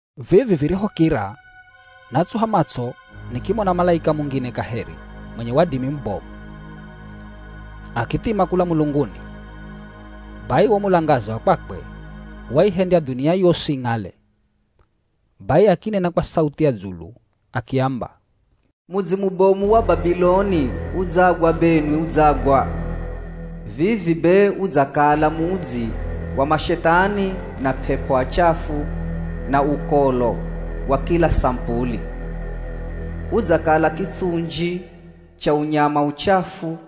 Vivi virihokira, natsuha matso nikimona malaika mungine kaheri mwenye wadimi mubomu. Akithima kula mulunguni. Bai wo mulangaza wa kwakwe waihendya dhunia yosi ing'ale. Bai akinena kwa sauthi ya dzulu akiamba, “Mudzi mubomu wa Babiloni udzagwa benwi udzagwa! Vivi be udzakala mudzi wa mashethani na p'ep'o achafu na ukolo wa kila samupuli. Udzakala kitsunji cha unyama uchafu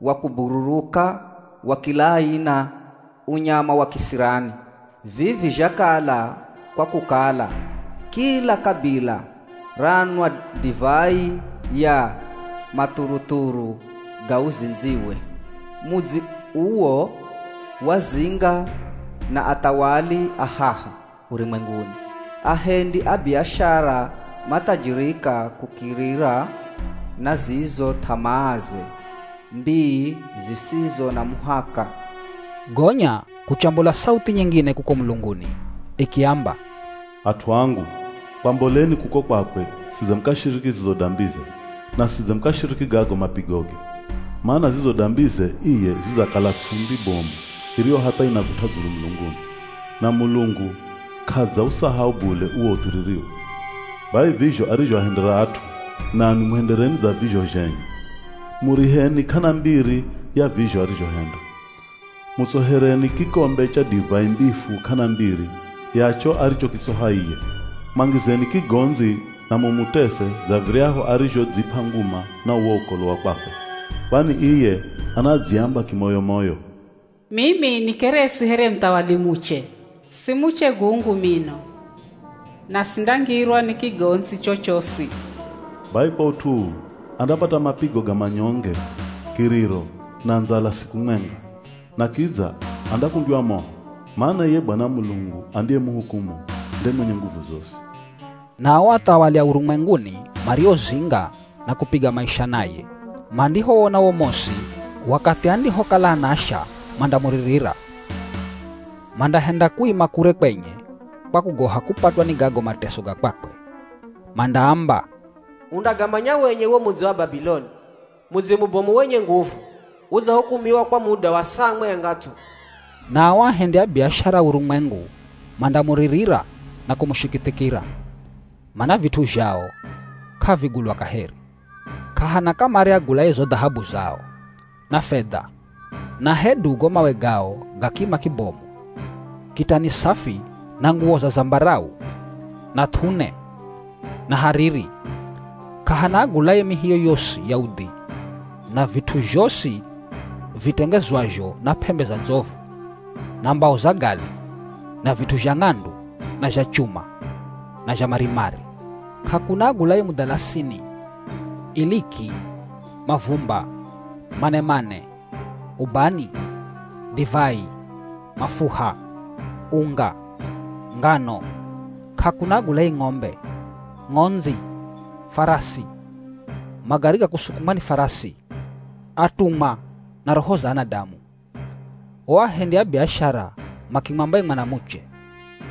wa kubururuka wa kila aina, unyama wa kisirani. Vivi zhakala kwa kukala kila kabila ranwa divai ya mathuruthuru ga uzindziwe. Mudzi uwo wazinga na athawali a haha urumwenguni. Ahendi a biashara mathajirika kukirira na zizo th'amaaze mbii zisizo na muhaka.” Gonya kuchambola sauthi nyingine kuko mulunguni ikiamba, “At'u angu, kwamboleni kuko kwakwe sidze mukashiriki zizo dambize, na sidze mukashiriki gago mapigoge. Mana zizo dambize iye zidzakala ts'umbi bomu iriyo hatha inagut'a dzulu mulunguni. Na Mulungu k'adzausahau bule uwo uthiririwe. Bai vizho arizhoahendera at'u, nanwi muhendereni dza vizho zhenye. Muriheni k'ana mbiri ya vizho arizhohenda. Mutsohereni kikombe cha divai mbifu k'ana mbiri ya cho arichokitsoha iye. Mwangizeni kigondzi na mumutese dza viryahu arizhodzip'a nguma na uwo ukolo wa kwakwe. Kwani iye anadziamba kimoyo-moyo, ‘Mimi nikeresi here muthawali muche. Si muche gungu mino na sindangirwa ni kigondzi chochosi.’ Bai kwa ut'u uu, andapata mapigo ga manyonge, kiriro, na ndzala siku mwenga. Na kidza andakundywa moho, mana iye Bwana Mulungu andiyemuhukumu, nde mwenye nguvu zosi.” Na o athawali a urumwenguni mariozinga na kupiga maisha naye, mandihowona wo mosi wakathi andihokala anasha mandamuririra. Mandahenda kuima kure kwenye kwa kugoha kupatwa ni gago mateso ga kwakwe. Mandaamba, “Undagamanya wenye wo mudzi wa Babiloni! Mudzi mubomu wenye nguvu, udzahukumiwa kwa muda wa saa mwenga thu.” Na o ahendi a biashara a urumwengu mandamuririra na kumushikithikira, mana vit'u zhao k'avigulwa kaheri. K'ahana kamare agulaye zo dhahabu zao, na fedha, na hedu go mawe gao ga kima kibomu, kitani safi na nguwo za zambarau, na th'une, na hariri. K'ahana agulaye mihi yoyosi ya udhi na vit'u zhosi vitengezwazho na p'embe za ndzovu, na mbao za gali, na vit'u zha ng'andu, na zha chuma, na zha marimari. K'akuna agulaye mudhalasini, iliki, mavumba, manemane, ubani, divai, mafuha, unga, ngano. K'akuna agulaye ng'ombe, ng'ondzi, farasi, magari ga kusukumwa ni farasi, atumwa na roho za anadamu. O ahendi a biashara makimwamba ye mwanamuche,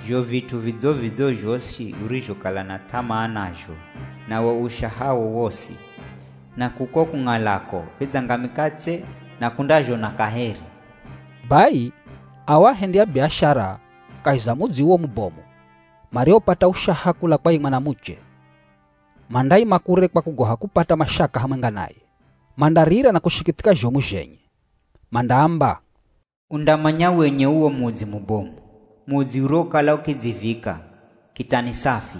“Zho vit'u vidzo-vidzo zhosi urizhokala na th'amaa nazho, na wo ushahawo wosi, na kuko kung'alako vidzangamika tse na k'undazhona kaheri.” Bai ao ahendi a biashara kahi za mudzi uwo mubomu, mariopata ushaha kula kwa ye mwanamuche, mandaima kure kwa kugoha kupata mashaka hamwenga naye. Mandarira na kushikithika zhomu zhenye. Mandaamba, “Undamanya wenye uwo mudzi mubomu. Mudzi uriwokala ukidzivika, kitani safi,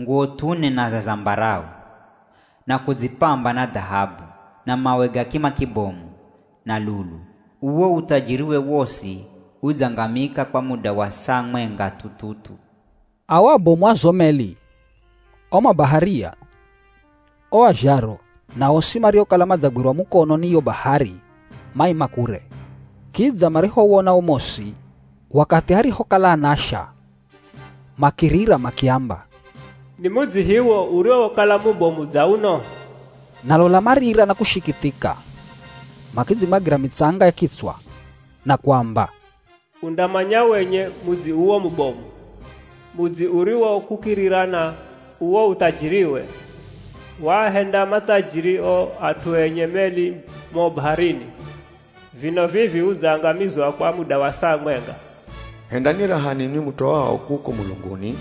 nguwo th'une na za zambarau, na kudzipamba na dhahabu, na mawe ga kima kibomu, na lulu. Uwo uthajiriwe wosi udzangamika kwa muda wa saa mwenga thu-thu-thu.” Ao abomu a zo meli, o mabaharia, o azharo na osi mariokala madzagwirwa mukono ni yo bahari maima kure. Kidza marihowona wo mosi wakathi arihokala anasha makirira makiamba, “Ni mudzi hiwo uriwokala mubomu dza uno?” Na lola marira na kushikithika. Makidzimwagira mitsanga ya kitswa na kuamba, “Undamanya wenye mudzi uwo mubomu. Mudzi uriwo kukirira na uwo uthajiriwe, waahenda mathajiri o at'u enye meli mo baharini. Vino vivi udzangamizwa kwa muda wa saa mwenga.” Hendani raha ninwi mutoao kuko mulunguni,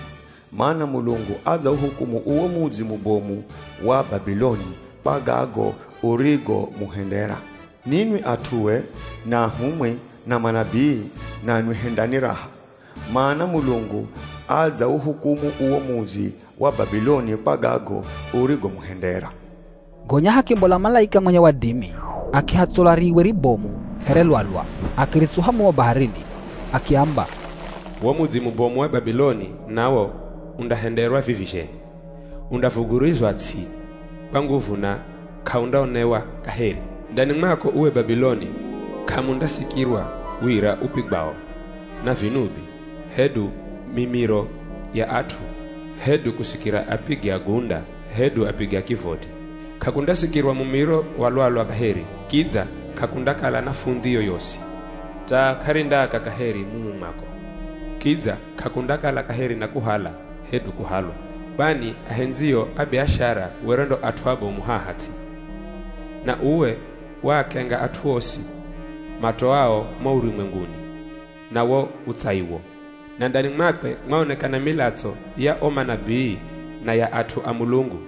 mana Mulungu adzauhukumu uwo mudzi mubomu wa Babiloni kwa gago urigomuhendera. Ninwi at'ue, na ahumwi, na manabii, nanwi hendani raha, mana Mulungu adzauhukumu uwo mudzi wa Babiloni kwa gago urigomuhendera. Gonya hakimbola malaika mwenye wadimi, akihatsola riiwe ribomu here lwalwa, akiritsuha mumo baharini. Akiamba, “Wo mudzi mubomu wa Babiloni nawo undahenderwa vivi zhenye. Undavugurizwa ts'i kwa nguvu na k'aundaonewa kaheri. Ndani mwako uwe Babiloni, k'amundasikirwa wira upigwao na vinubi, hedu mimiro ya at'u, hedu kusikira apigi a gunda, hedu apigi a kivoti. K'akundasikirwa mumiro wa lwalwa kaheri, kidza k'akundakala na fundhi yoyosi. Taa k'arindaaka kaheri mumu mwako. Kidza k'akundakala kaheri na kuhala, hedu kuhalwa. Kwani ahendzio a biashara were ndo at'u abomu haha ts'i, na uwe waakenga at'u osi matoao mo urumwenguni na wo utsaiwo. Na ndani mwakwe mwaonekana milatso ya o manabii na ya at'u a Mulungu,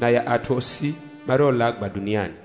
na ya at'u osi mariolagwa dhuniani.”